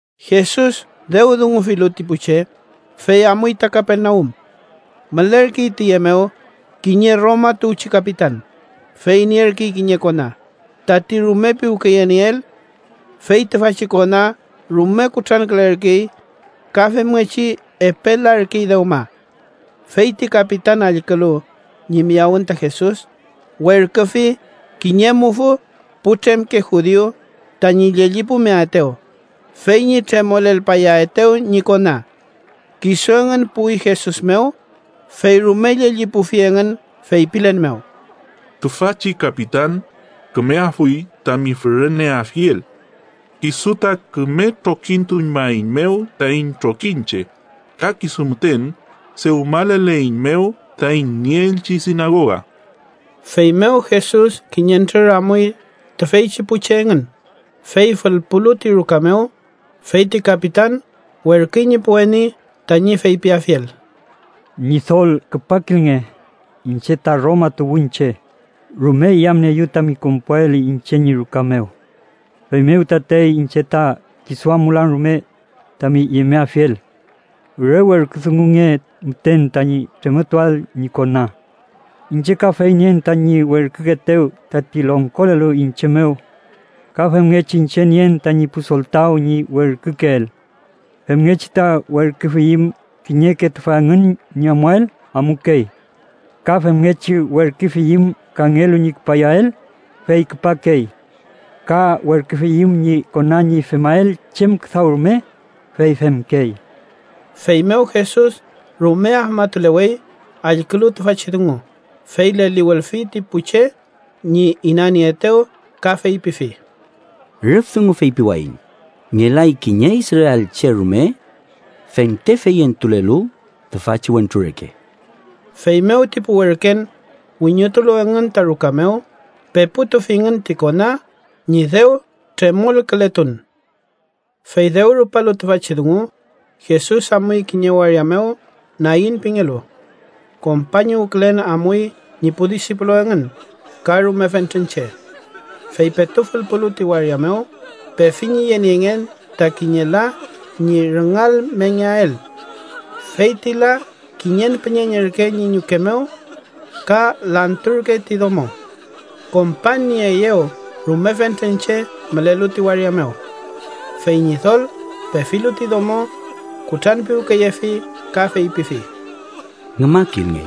Jesus dew dungufilu ti pu che, fey amuy ta Kapernaum. Mülerkey tüye mew kiñe Roma tuwchi kapitan, fey nierkey kiñe kona, tañi rume piwkeyenieel. Fey tüfachi kona rume kutrankülerkey ka femngechi epe larkey dewma. Fey ti kapitan allkülu ñi miyawün ta Jesus, werküfi kiñe mufü putremke judiu tañi llellipulmeaetew fey ñi tremolelpayaetew ñi kona. Kisu engün puwi Jesus mew, fey rume llellipufi engün feypilen mew: —Tüfachi kapitan kümeafuy tami füreneafiel. Kisu ta küme trokituñmaeiñmew taiñ trokiñche ka kisu müten dewmaleleiñmew taiñ nieelchi sinagoga. Feymew Jesus kiñentrür amuy tüfeychi pu che engün, fey fülpulu ti ruka mew, fey ti kapitan werküy ñi pu weni tañi feypiafiel: —Ñidol, küpakilnge. Iñche ta Roma tuwünche. Rume yamnieeyu tami konpuael iñche ñi ruka mew. Feymew tatey iñche ta kisu amulan rume tami yemeafiel. Re werküdungunge müten tañi tremoltuael ñi kona. Iñche kafey nien tañi werkükeetew tati longkolelu iñche mew ka femngechi iñche nien tañi pu soltaw ñi werkükeel. Femngechi ta werküfiyüm kiñeke tüfa engün ñi amuael, amukey. Ka femngechi werküfiyüm kangelu ñi küpayael, fey küpakey. Ka werküfiyüm ñi kona ñi femael chem küdaw rume, fey femkey. Feymew Jesus rume afmatulewey allkülu tüfachi dungu, fey leliwülfi ti pu che ñi inanieetew ka feypifi: —Rüf dungu feypiwayiñ, ngelay kiñe israelche rume fente feyentulelu tüfachi wentru reke. Feymew ti pu werken, wiñotulu engün ta ruka mew, peputufingün ti kona ñi dew tremolkületun. Fey dew rupalu tüfachi dungu, Jesus amuy kiñe waria mew Nain pingelu. Kompañuwkülen amuy ñi pu disipulu engün ka rume fentren che. Fey petu fülpulu ti waria mew, pefi ñi yeniengen ta kiñe la ñi rüngalmengeael. Feyti la kiñen püñeñ ürke ñi ñuke mew ka lanturkey ti domo. Kompañnieeyew rume fentren che mülelu ti waria mew. Fey Ñidol, pefilu ti domo, kutranpiwkeyefi ka feypifi: —Ngümakilnge.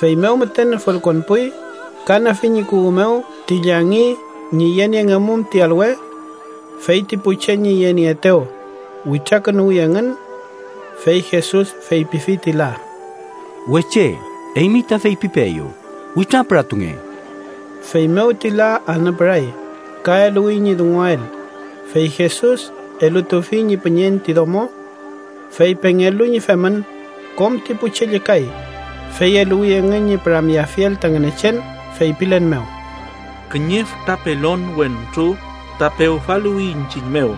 Feymew müten fülkonpuy, ka nüfi ñi kuwü mew ti llangi ñi yeniengemum ti alwe. Fey ti pu che ñi yenieetew, witrakünuwi engün. Fey Jesus feypifi ti la: —Weche, eymi ta feypipeeyu: ¡Witrapüratunge! Feymew ti la anüpüray ka eluwi ñi dunguael, fey Jesus elutufi ñi püñeñ ti domo. Fey pengelu ñi femün, kom ti pu che llükay, fey eluwi engün ñi püramyeafiel ta Ngünechen feypilen mew: —Kiñe fütra pelon wentru ta pewfaluwi iñchiñ mew.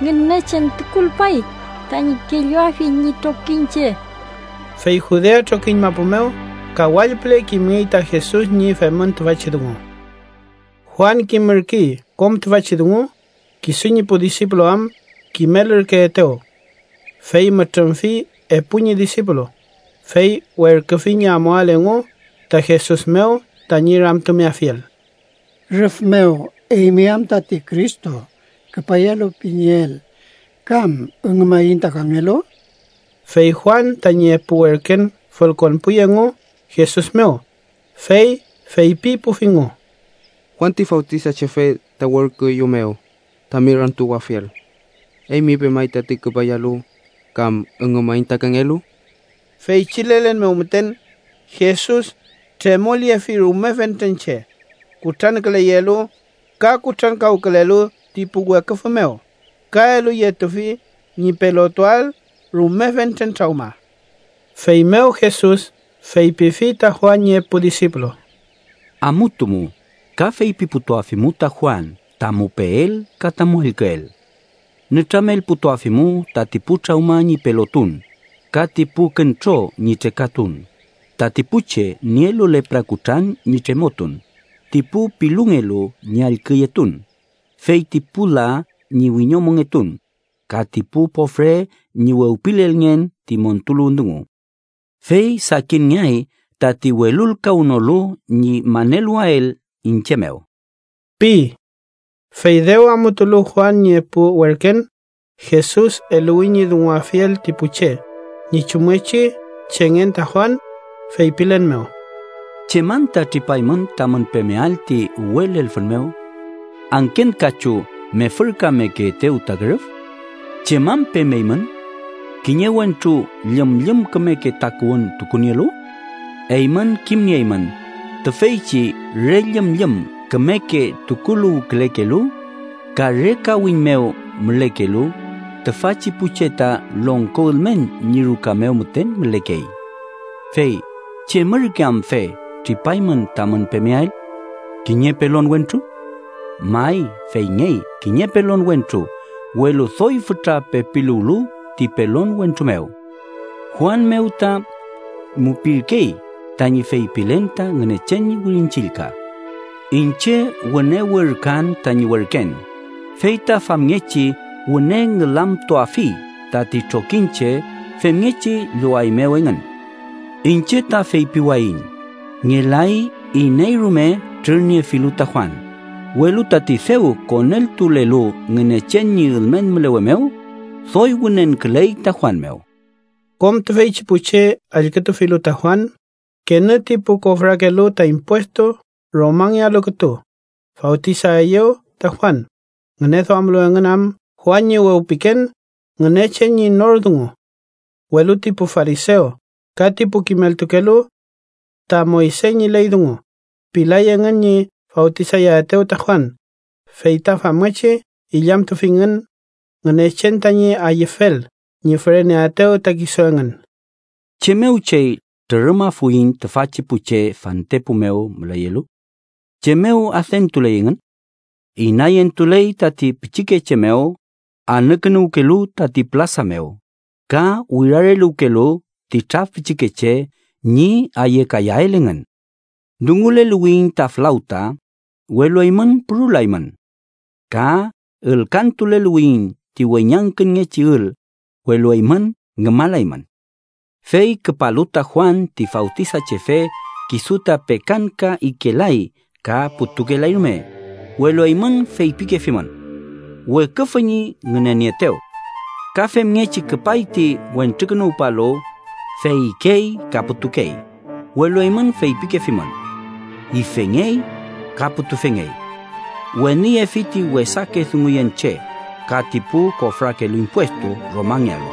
Ngünechen tukulpay tañi kelluafiel ñi trokiñche. Fey Judea trokiñ mapu mew ka wall püle kimngey ta Jesus ñi femün tüfachi dungu. Juan kimürkey kom tüfachi dungu, kisu ñi pu disipulu am kimelürkeetew. Fey mütrümfi epu ñi disipulu, fey werküfi ñi amuael engu ta Jesus mew tañi ramtumeafiel: “¿Rüf mew eymi am tati Cristo küpayalu pinieel kam üngümaiñ ta kangelu?” Fey Juan tañi epu werken fülkonpuy engu Jesus mew, fey feypipufingu: —Juan ti Fawtisachefe ta werküeyumew tami ramtuwafiel ta ‘¿eymi pemay tati küpayalu kam üngümaiñ ta kangelu?’ Feychi lelen mew müten, Jesus tremolyefi rume fentren che kutranküleyelu ka kutrankawkülelu ti pu weküfü mew ka eluyetufi ñi pelotuael rume fentren trawma. Feymew Jesus feypifi ta Juan ñi epu disipulu: —Amutumu ka feypiputuafimu ta Juan tamu peel ka tamu allküel. Nütramelputuafimu tati pu trawma ñi pelotun, ka ti pu küntro ñi trekatun, tati pu che nielu lepra kutran ñi tremotun, ti pu pilungelu ñi allküyetun, feyti pu la ñi wiñomongetun, ka ti pu pofre ñi wewpilelngen ti montuluwün dungu. ¡Fey sakinngeay tati welulkawnolu ñi maneluwael iñche mew! ―pi. Fey dew amutulu Juan ñi epu werken, Jesus eluwi ñi dunguafiel ti pu che ñi chumngechi chengen ta Juan, feypilen mew: “¿Chem anta tripaymün tamün pemeael ti uwe lelfün mew? ¿Angken kachu mefürkamekeetew ta kürüf? ¿Chem am pemeymün? ¿Kiñe wentru llümllüm kümeke takuwün tukunielu? Eymün kimnieymün tüfeychi re llümllüm kümeke tukuluwkülekelu ka re kawiñ mew mülekelu, tüfachi pu che ta longko ülmen ñi ruka mew müten mülekey. Fey ¿chem ürke amfe tripaymün tamün pemeael? ¿Kiñe pelon wentru? May, feyngey, kiñe pelon wentru, welu doy fütra pepiluwlu ti pelon wentru mew Juan mew ta mupirkey tañi feypilen ta Ngünechen ñi Wirin Chillka: ‘Iñche wüne werküan tañi werken, fey ta famngechi wüne ngülamtuafi tati trokiñche femngechi llowaeymew engün.’ Iñche ta feypiwayiñ, ngelay iney rume trürniefilu ta Juan, welu tati dew koneltulelu Ngünechen ñi ülmen mülewe mew, doy wünenküley ta Juan mew.” Kom tüfeychi pu che allkütufilu ta Juan, kenü ti pu kofrakelu ta impuestu Romangealu kütu fawtisaeyew ta Juan, ngüneduamlu engün am Juan ñi wewpiken Ngünechen ñi nor dungu. Welu ti pu farisew ka ti pu kimeltukelu ta Moyse ñi ley dungu, pilay engün ñi fawtisayaetew ta Juan, fey ta famngechi illamtufingün Ngünechen tañi ayüfel ñi füreneaetew ta kisu engün. “¿Chem mew chey trürümafuiñ tüfachi pu che fantepu mew müleyelu? ¿Chem mew adentuley engün? Inayentuley tati pichikeche mew anükünuwkelu tati pülasa mew ka wirareluwkelu ti traf pichikeche ñi ayekayael engün: ‘Dunguleluwiyiñ ta flawta, welu eymün purulaymün. Ka ülkantuleluwiyiñ ti weñangkünngechi ül, welu eymün ngümalaymün.’ Fey küpalu ta Juan ti Fawtisachefe kisu ta pekanka ikelay ka putukelay rume, welu eymün feypikefimün: ‘weküfü ñi ngünenieetew.’ Ka femngechi küpay ti Wentrukünuwpalu, fey ikey ka putukey, welu eymün feypikefimün: ‘ifengey ka putufengey.’ Weniyefi ti wesake dunguyen che ka ti pu kofrakelu impuestu Romangealu.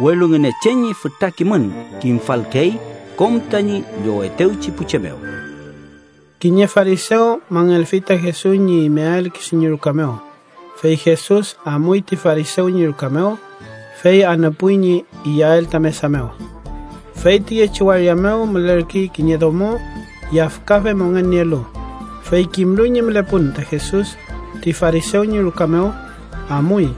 Welu Ngünechen ñi fütra kimün kimfalkey kom tañi llowetewchi pu che mew.” Kiñe farisew mangelfi ta Jesus ñi imeael kisu ñi ruka mew, fey Jesus amuy ti farisew ñi ruka mew, fey anüpuy ñi iyael ta mesa mew. Fey tiyechi waria mew mülerkey kiñe domo yafkafe mongen nielu. Fey kimlu ñi mülepun ta Jesus ti farisew ñi ruka mew, amuy,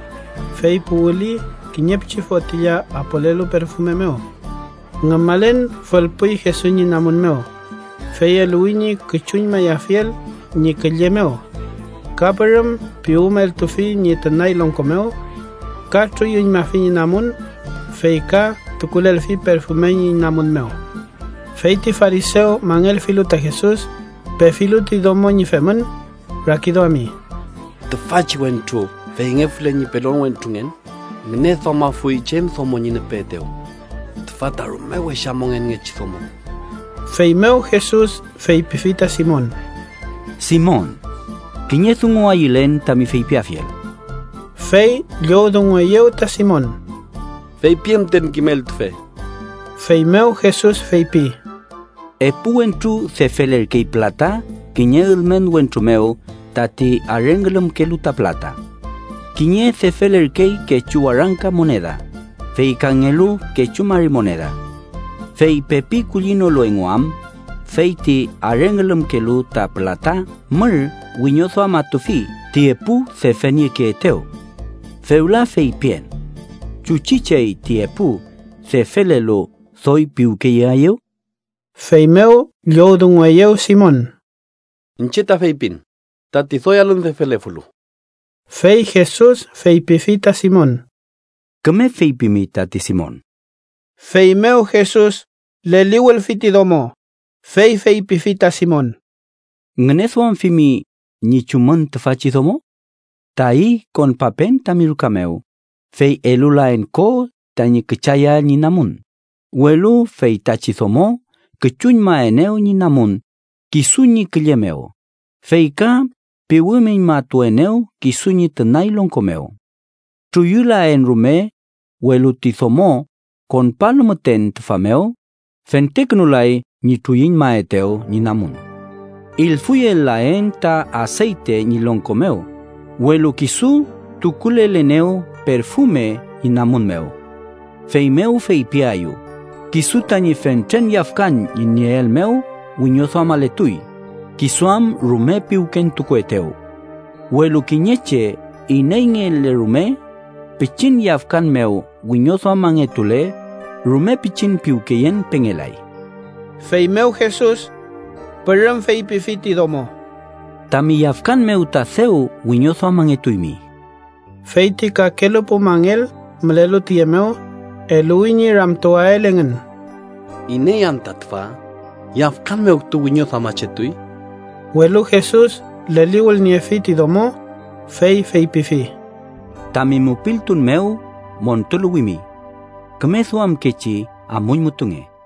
fey puwüli kiñe pichi fotilla apolelu perfume mew. Ngümalen fülpuy Jesus ñi namun, fey eluwi ñi küchuñmayafiel ñi külle mew. Ka pürüm piwümeltufi ñi tünay longko mew. Ka truyuñmafi ñi namun, fey ka tukulelfi perfume ñi namun mew. Fey ti farisew mangelfilu ta Jesus, pefilu ti domo ñi femün, rakiduami: “Tüfachi wentru feyngefule ñi pelon wentrungen, ngüneduamafuy chem domo ñi nüpeetew. Tüfa ta rume wesa mongenngechi domo.” Feymew Jesus feypifi ta Simon: —Simon, kiñe dungu ayülen tami feypiafiel. Fey llowdungueyew ta Simon: —Feypien müten, kimeltufe. Feymew Jesus feypi: —Epu wentru defelerkey pülata kiñe ülmen wentru mew tati arengülümkelu ta pülata. Kiñe defelerkey kechu warangka moneda, fey kangelu kechu mari moneda. Fey pepi kullinolu engu am, fey ti arengülümkelu ta pülata mür wiñoduamatufi ti epu defeniekeetew. Fewla feypien: ¿chuchi chey ti epu defelelu doy piwkeyeaeyew? Feymew llowdungueyew Simon: —Iñche ta feypin tati doy alün defelefulu. Fey Jesus feypifi ta Simon: —Küme feypimi tati, Simon. Feymew Jesus leliwülfi ti domo, fey feypifi ta Simon: —¿Ngüneduamfimi ñi chumün tüfachi domo? Tayi konpapen tami ruka mew, fey elulaen ko tañi küchayael ñi namun, welu feytachi domo küchuñmaenew ñi namun kisu ñi külle mew, fey ka piwümüñmatuenew kisu ñi tünay longko mew. Truyulaen rume, welu ti domo konpalu müten tüfa mew, fentekünulay ñi truyuñmaetew ñi namun. Ilfuyel-laen ta aseyte ñi longko mew, welu kisu tukulelenew perfume ñi namun mew. Feymew feypiaeyu kisu tañi fentren yafkan ñi nieel mew wiñoduamaletuy, kisu am rume piwkentukuetew. Welu kiñe che ineyngele rume pichin yafkan mew wiñoduamangetule, rume pichin piwkeyen pengelay. Feymew Jesus pürüm feypifi ti domo: —Tami yafkan mew ta dew wiñoduamangetuymi. Fey ti kakelu pu mangel mülelu tüye mew, eluwi ñi ramtuwael engün: “¿Iney anta tüfa, yafkan mew kütu wiñoduamachetuy?” Welu Jesus leliwülniefi ti domo, fey feypifi: —Tami mupiltun mew montuluwimi. Küme duamkechi amuñmutunge.